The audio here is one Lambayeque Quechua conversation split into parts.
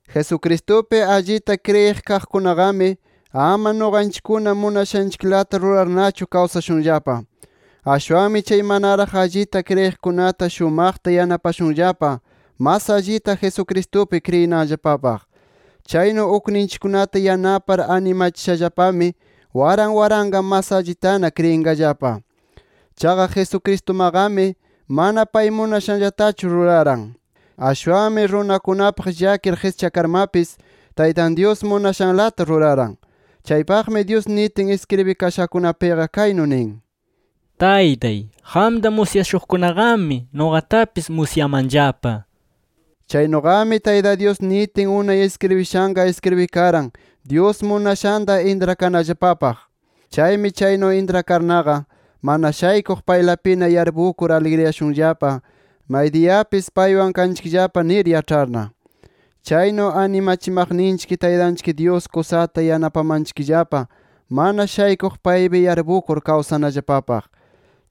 Jesucristupi allita kriyiq kaqkunaqami, ama nuqanchikkuna munashanchiklata rurarnachu kawsashunllapa. Ashwanmi chay manaraq allita kriyiqkunata shumaqta yanapashunllapa, mas allita Jesucristupi kriyinanllapapaq. Chaynu ukninchikkunata yanapar animachishallapami waran waranqa mas allitana kriyinqallapa. Chaqa Jesucristumaqami, mana pay munashanllatachu ruraran. Ashwanmi runakunapaq llakir qischakarmapis, Taytan Dyus munashanlata ruraran. Chaypaqmi Dyus nitin iskribikashakunapiqa kaynu nin: “Taytay, qamta musyashuqkunaqami nuqatapis musyamanllapa” nir. Chaynuqami Tayta Dyus nitin unay iskribishanqa iskribikaran Dyus munashanta intrakanallapapaq. Chaymi chaynu intrakarnaqa, mana shaykuq paylapina yarpukur, aligriyashunllapa maydiyapis paywan kanchikllapa nir yaĉharna. Chaynu animachimaqninchik Taytanchik Dyus kusata yanapamanchikllapa, mana shaykuq paypi yarpukur kawsanallapapaq.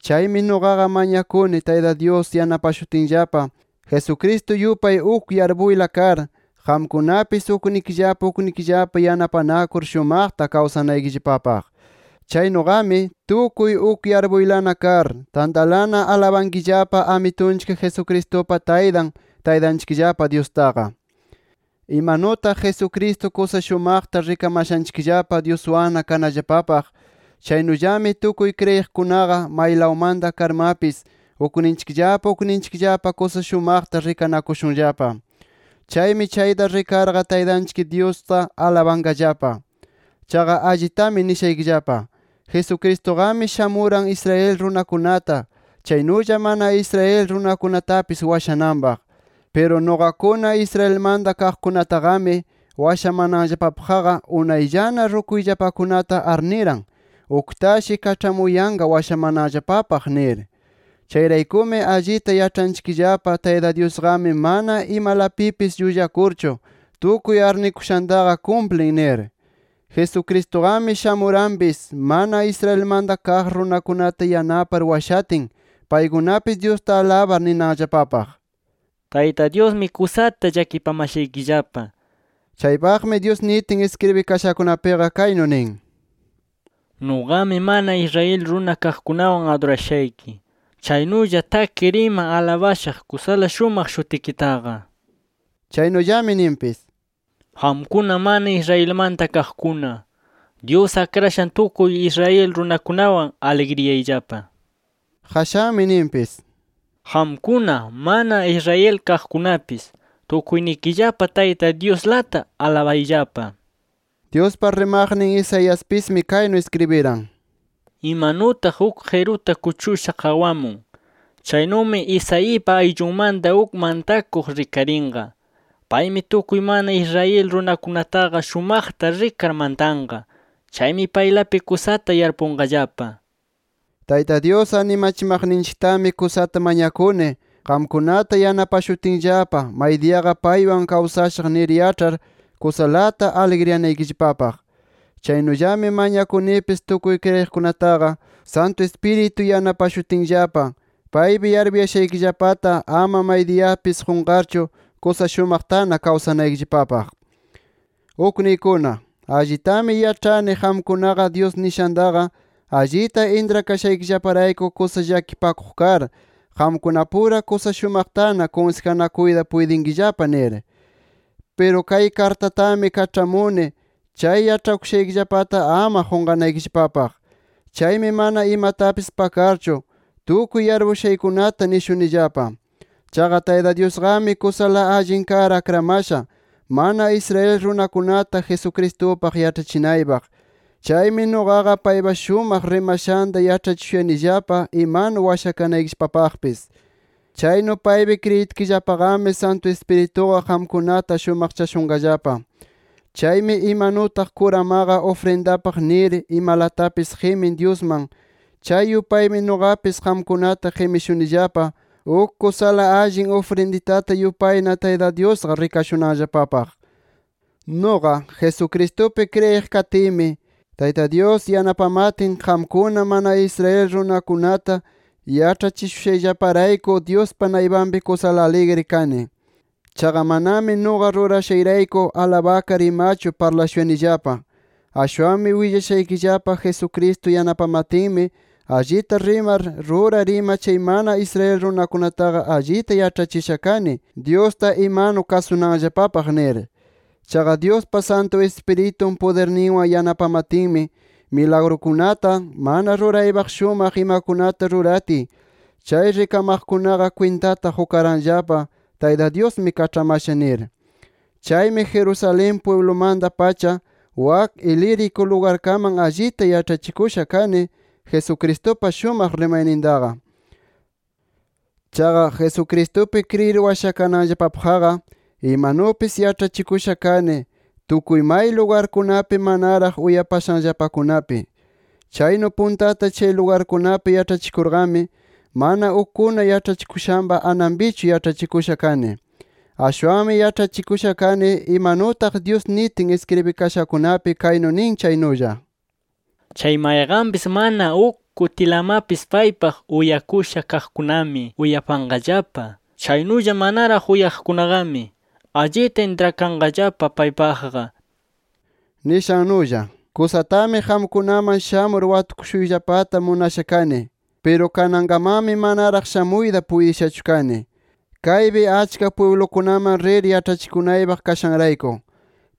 Chaymi nuqaqa mañakuni Tayta Dyus yanapashutinllapa, Jesucristo yupay uk yarpuyla kar, qamkunapis uknikillapa uknikillapa yanapanakur shumaqta kawsanaykillapapaq. Chaynuqami, tukuy uk yarpuylana kar, tantalana alabankillapa Amitunchik Jesucristupa Taytan, Taytanchikllapa Dyustaqa. Imanutaq Jesucristo kusa shumaqta rikamashanchikllapa Dyuswanna kanallapapaq, chaynullami tukuy kriyiqkunaqa, maylawmanta karmapis ukninchikllapa ukninchikllapa kusa shumaqta rikanakushunllapa. Chaymi chayta rikarqa Taytanchik Dyusta alabanqallapa. Chaqa allitami nishaykillapa: Jesucristuqami, shamuran Israel runakunata, chaynulla mana Israel runakunatapis washananpaq. Piru nuqakuna Israelmanta kaqkunataqami, washamananllapapaqqa unayllana rukuyllapakunata arniran, uktashi kaĉhamuyanqa washamananllapapaq nir. Chayraykumi allita yaĉhanchikllapa Tayta Dyusqami mana imalapipis llullakurchu, tukuy arnikushantaqa kumplin nir. Jesucristuqami shamuranpis, mana Israelmanta kaq runakunata yanapar washatin, paykunapis Dyusta alabar ninanllapapaq: “Tayta Dyusmi kusata llakipamashanchikllapa” nir. Chaypaqmi Dyus nitin iskribikashakunapiqa kaynu nin: “Nuqami mana Israel runa kaqkunawan adurashayki. Chaynulla takir ima alabashaq kusala shumaq shutikitaqa” nir. Chaynullami ninpis: “Qamkuna mana Israelmanta kaqkuna, Dyus akrashan tukuy Israel runakunawan aligriyayllapa” nir. Qashanmi ninpis: “Qamkuna mana Israel kaqkunapis tukuynikillapa Tayta Dyuslata alabayllapa” nir. Dyuspa rimaqnin Isaiaspismi kaynu iskribiran: “Imanutaq uk qiruta kuchusha qawamun, chaynumi Isaipa ayllunmanta uk mantakuq rikarinqa. Paymi tukuy mana Israel runakunataqa shumaqta rikar mantanqa. Chaymi paylapi kusata yarpunqallapa” nir. Tayta Dyus animachimaqninchiktami kusata mañakuni, qamkunata yanapashutinllapa maydiyaqa paywan kawsashaq nir yaĉhar kusalata aligriyanaykillapapaq. Chaynullami mañakunipis tukuy kriyiqkunataqa Santu Ispiritu yanapashutinllapa, paypi yarpuyashaykillapata ama maydiyapis qunqarchu, kusa shumaqtana kawsanaykillapapaq. Ukniykuna, allitami yaĉhani qamkunaqa Dyus nishantaqa allita intrakashaykillaparayku, kusa llakipakuq kar, qamkunapura kusa shumaqtana kunsijanakuyta puytinkillapa nir. Piru kay kartatami kaĉhamuni, chay yaĉhakushaykillapata ama qunqanaykillapapaq. Chaymi mana imatapis pakarchu, tukuy yarpushaykunata nishunillapa. Chaqa Tayta Dyusqami kusala allin kar akramasha, mana Israel runakunata Jesucristupaq yaĉhachinaypaq. Chaymi nuqaqa paypa shumaq rimashanta yaĉhachishuyanillapa imanu washakanaykillapapaqpis. Chaynu paypi kriyitkillapaqami Santu Ispirituqa qamkunata shumaqchashunqallapa. Chaymi imanutaq kuramaqa ufrindapaq nir imalatapis qimin Dyusman, chay yupaymi nuqapis qamkunata qimishunillapa, uk kusala allin ufrinditata yupayna Tayta Dyusqa rikashunanllapapaq. Nuqa, Jesucristupi kriyiq katiymi, Tayta Dyus yanapamatin qamkuna mana Israel runakunata yaĉhachishushayllaparayku, Dyuspa naypanpi kusala aligri kani. Chaqa manami nuqa rurashayrayku alabakar imachu parlashuyanillapa. Ashwanmi willashaykillapa, Jesucristo yanapamatinmi, allita rimar, rurar ima chay mana Israel runakunataqa allita yaĉhachisha kani, Dyusta imanu kasunanllapapaq nir. Chaqa Dyuspa Santu Ispiritun pudirninwan yanapamatinmi, milagrukunata, mana ruraypaq shumaq imakunata ruratiy, chay rikamaqkunaqa kwintata qukaranllapa Tayta Dyusmi kaĉhamasha nir. Chaymi Jerusalén pwiblumanta-pacha wak Ilírico lugarkaman allita yaĉhachikusha kani, Jesucristupa shumaq rimaynintaqa. Chaqa, Jesucristupi kriyir washakananllapapaqqa imanupis yaĉhachikusha kani, tukuy may lugarkunapi manaraq uyapashanllapakunapi. Chaynu puntata chay lugarkunapi yaĉhachikurqami, mana ukkuna yaĉhachikushanpa ananpichu yaĉhachikusha kani. Ashwanmi yaĉhachikusha kani, imanutaq Dyus nitin iskribikashakunapi kaynu nin chaynulla: “Chay mayqanpis mana uk kutilamapis paypaq uyakusha kaqkunami uyapanqallapa. Chaynulla manaraq uyaqkunaqami allita intrakanqallapa paypaqqa” nishannulla. Kusatami qamkunaman shamur watukushuyllapata munasha kani. Piru kanankamanmi manaraq shamuyta puytishachu kani, kaypi achka pwiblukunaman rir yaĉhachikunaypaq kashanrayku.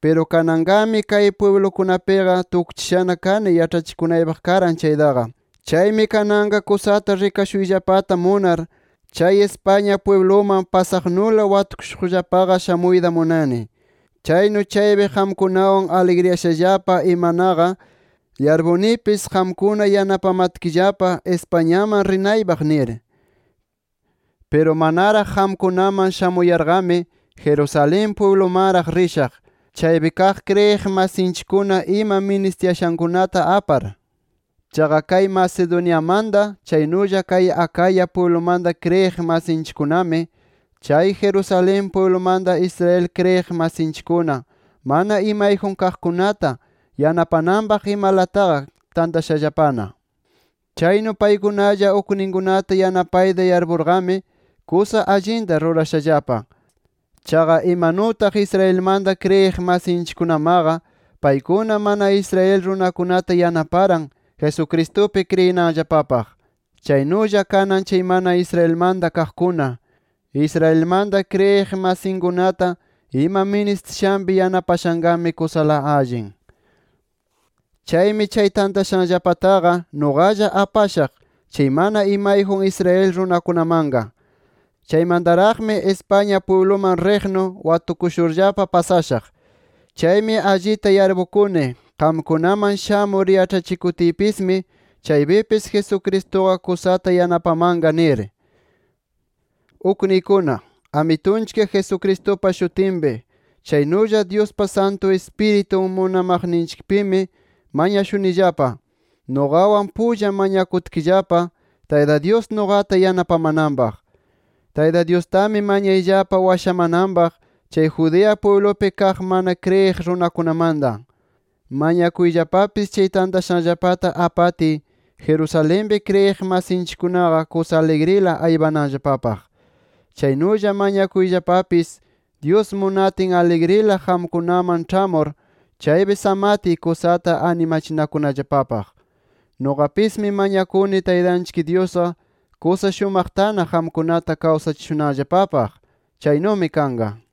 Piru kananqami kay pwiblukunapiqa tukchishana kani yaĉhachikunaypaq karan chaytaqa. Chaymi kananqa kusata rikashuyllapata munar, chay España pwibluman pasaqnula, watukushuqllapaqa shamuyta munani. Chaynu chaypi qamkunawan aligriyashallapa imanaqa, yarpunipis qamkuna yanapamatkillapa Españaman rinaypaq nir. Piru manaraq qamkunaman shamuyarqami, Jerusalén pwiblumanraq rishaq, chaypi kaq kriyiq masinchikkuna ima ministiyashankunata apar. Chaqa kay Macedoniamanta, chaynulla kay Acaya pwiblumanta kriyiq masinchikkunami, chay Jerusalén pwiblumanta Israel kriyiq masinchikkuna mana imayjun kaqkunata yanapananpaq imalataqa tantashallapana. Chaynu paykunalla ukninkunata yanapayta yarpurqami, kusa allinta rurashallapa. Chaqa imanutaq Israelmanta kriyiq masinchikkunamaqa paykuna mana Israel runakunata yanaparan Jesucristupi kriyinanllapapaq. Chaynulla kanan chay mana Israelmanta kaqkuna, Israelmanta kriyiq masinkunata ima ministishanpi yanapashanqami, kusala allin. Chaymi chay tantashanllapataqa nuqalla apashaq chay mana imayjun Israel runakunamanqa. Chaymantaraqmi España pwibluman riqnu watukushurllapa pasashaq. Chaymi allita yarpukuni, qamkunaman shamur yaĉhachikutiypismi, chaypipis Jesucristuqa kusata yanapamanqa nir. Ukniykuna, Amitunchik Jesucristupa shutinpi, chaynulla Dyuspa Santu Ispiritun munamaqninchikpimi mañashunillapa, nuqawan pulla mañakutkillapa Tayta Dyus nuqata yanapamananpaq. Tayta Dyustami mañayllapa washamananpaq chay Judea pwiblupi kaq mana kriyiq runakunamanta. Mañakuyllapapis chay tantashanllapata apatiy, Jerusalenpi kriyiq masinchikkunaqa kusa aligrila aypananllapapaq. Chaynulla mañakuyllapapis, Dyus munatin aligrila qamkunaman ĉhamur chaypi samatiy, kusata animachinakunallapapaq. Nuqapismi mañakuni, Taytanchik Dyusqa kusa shumaqtana qamkunata kawsachishunanllapapaq. ¡Chaynumi kanqa!